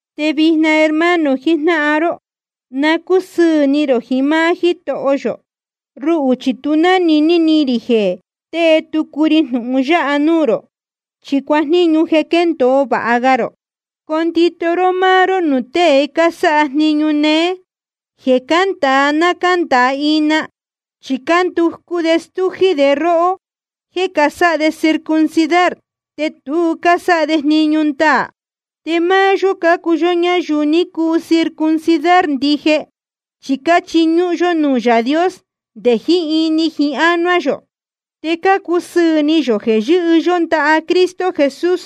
Te vijna, hermano jijnáhan ró, na cúsɨɨ̄ ni rō jiín máá Jítoho yō. Ruhū chi tu jnániní ni rī jeē tée tucu ri jnūhun yáha núū rō, chi cuajníñu jeē quéndōo vāha ga rō. Condito ró máá ró nuū tée cásáha jniñu néé, jeē cándāa ná cándāa ina. Chi cánducú de stújí de róhó jéē casáha de circuncidar, te tu cásáha de jniñu ndaā. Te máá yó cácuu ñayuu ni cuu circuncidar ndije, chi cáchiñúhún yó nuū Yaā Dios nde jiín ini jiín ánuá yō, te cácusɨɨ̄ ni yō jeē yɨhɨ́ yó ndaha Cristo Jesús,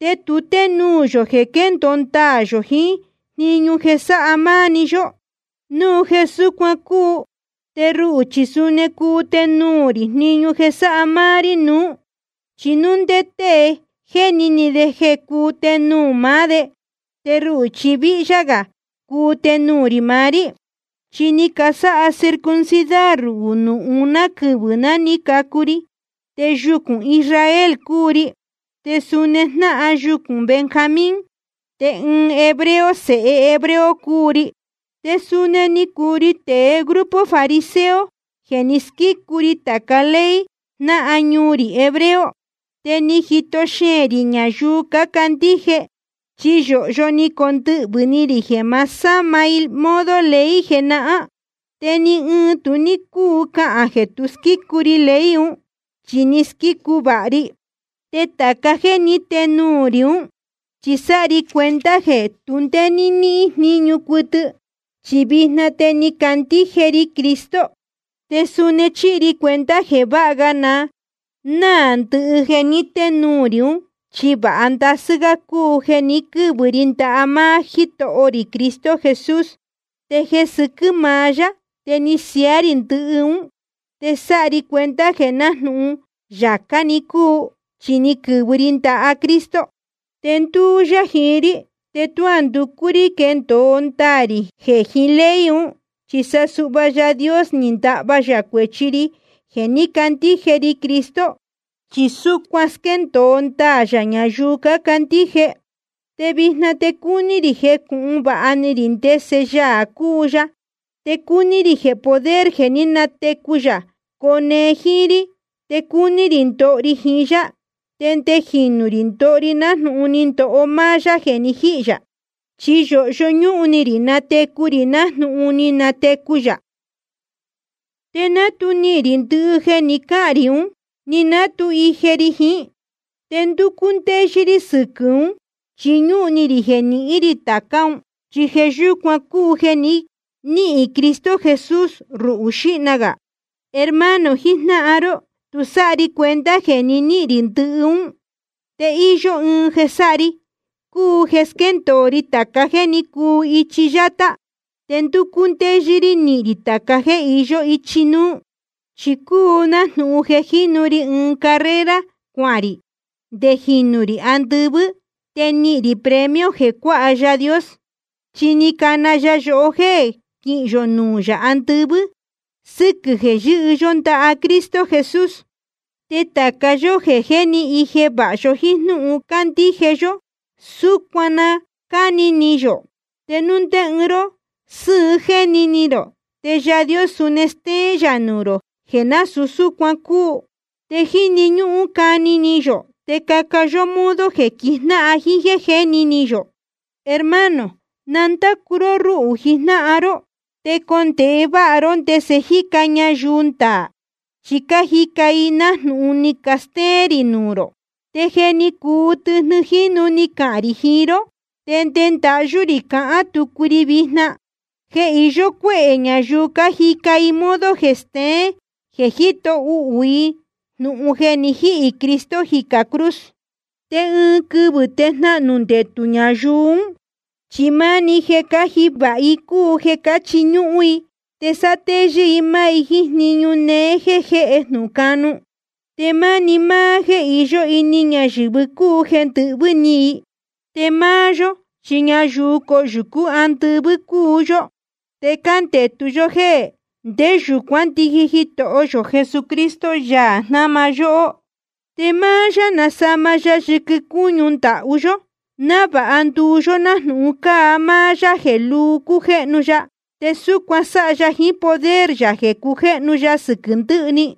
te tu ténuū yō jeē quéndōo ndaā yō jiín jniñu jeē sáha máá‑ni yó. Núu jeē súcuan cúu te ruhū chi suni cuu tenuū rī jniñu jeē sáha máá‑ni ri nuú. Chi núu ndé tée jéni ni de jeē cuu tenuū de máá de, te ruhū chi víhyá gā cuu tenuū rī maá rí. Chi ni casáha circuncidar ruhū nuū uná quɨvɨ̄ ná ni cacu ri. Te yucūn Israel cúu ri, te suni jnáhan yucūn Benjamín, te ɨɨn hebreo sēhe hebreo cúu ri. Te suni ni cuu ri tēe grupo fariseo jeē ni squícu ri tāca ley jnáhan ñuu rī hebreo. Te ni jito xeēn rī ñayuu cácandíje, chi yōhyo ni condɨhvɨ̄ ni rī jeē ma sáma i modo ley jenahán. Te ni ɨɨn tu ní cúu cahān jeē tu squícu ri ley un, chi ni squícu vāha ri. Te tāca jéē ní tenuū rī ún, chi sáha ri cuenta jeē tu ndé níhín jníñu cuɨtɨ, chi vijna te ni candíje ri Cristo. Te suni chíhi ri cuenta jeē vāha ga na náā ndɨhɨ jeē ní tenuū rī ún, chi vāha ndasɨ́ gá cúu jeē ni quɨ́vɨ ri ndaha máá Jítoho rī Cristo Jesús. Te jeē sɨquɨ́ maá yá te ni siaá rī ndɨhɨ ún, te sáha ri cuenta jeē nájnūhun yācá‑ni cúu. Chi ni quɨ̄vɨ ri ndaha Cristo, te ndúú yá jiín rí. Te tuá nducú rí quendōo ndaā rī jeē jiín ley un, chi sa suhva Yaā Dios ni ndahva yā cuēchi ri jeē ní candíje ri Cristo. Chi súcuan squéndōo ndaā yā ñayuu cácandíje. Te vijna te cúní rī jecūhun vāha ni rī ndese Yaā cúu ya. Te cúní rī jeē poder jeē ní natecu yā cone jíín rí. Te cúní rī ndoho ri jiín yá, te nde jinū rī ndoho ri nájnūhun ni ndoho máá yá jeē ni jíhī yā. Chi yōhyo ñúhun ni rī natecu rī nájnūhun ni natecu yā. Te ná tu nihīn rī ndɨhɨ jeē ni cáhān rī ún, ni ná tu ije ri jiín. Te ndúcú ndéyɨ́ rí sɨquɨ̄ ún, chi ñúhun ni rī jeē nihín rī tācá un, chi jeē yúcuan cúu jeē ni níhīn Cristo Jesús ruhū xīhna gā. Hermano jijnáhan ró, tu sáha ri cuenta jeē jé ni nihīn rī ndɨhɨ ún. Te íyó ɨɨn jeē sáha ri, cúu jeē squéndōo ri tāca jéē ní cuu ichi yátá, te ndúcú ndéyɨ́ rí nihīn rī tāca jéē iyó ichi núú. Chi cúu un nájnūhun jeē jínu ri ɨɨn carrera cuahān rī nde jinū rī andɨvɨ́, te nihīn rī premio jeē cuáha Yaā Dios. Chi ni cana ya yohó jéē quihín yō nuū yā andɨvɨ́ sɨquɨ̄ jeē yɨ́hɨ yó ndaha Cristo Jesús. Te tāca yó jeē jé ni ije vāha yó jíín jnúhun cándíje yó, súcuan na cáni ni yō. Te núu ndé ɨɨn ró sɨ́ɨn jéni ni rō, te Yaā Dios suni stéén yā nuū rō jeē násūu súcuan cúu. Te jíni ñúhún cani ni yō te caca yó modo jeē quijnáhan jíín jéē jé ni nihīn yō. Hermano, na ndácu ró rúhū jijnáhan ró. Te condēhe váha ró ndese cájica ñayuu ndaā, chi cájica i nájnūhun ni castéén rī nuū rō. Te je ni cuu tɨjnɨ jínu ni cahān rī jiín ró, te nde ndahyú rī cahán tucu ri vijna, jeē iyó cuéhē ñayuu cájica i ɨɨn modo jeē steén jeē jíto uhū i jnūhun jeē ni jíhī Cristo jicā cruz. Te ɨɨn quɨvɨ̄ te jnahnū ndetū ñayuu ún. Chi máni jeē cáji vāha i cúu jeē cáchiñúhún i. Te sátéyɨ́ i máá i jíín jniñu néé jeē jéhe jnūhun canu. Te máni máá jéē iyó ini ñayɨ̄vɨ cúu jeē ndɨhvɨ́ ni i. Te máá yó chi ñayuu coyūcú andɨvɨ́ cúu yó, te cándetu yó jéē nde yūcuán ndiji Jitoho yō Jesucristo, Yaā jnáma yóhó. Te máá yá nasama ya yɨquɨ cúñu ndahú yó, návāha nduu yó nájnūhun cáa máá yá jeē lúu cújéhnu ya. Te súcuan sáha ya jiín poder yā jeē cujéhnu ya sɨquɨ̄ ndɨhɨ‑ni.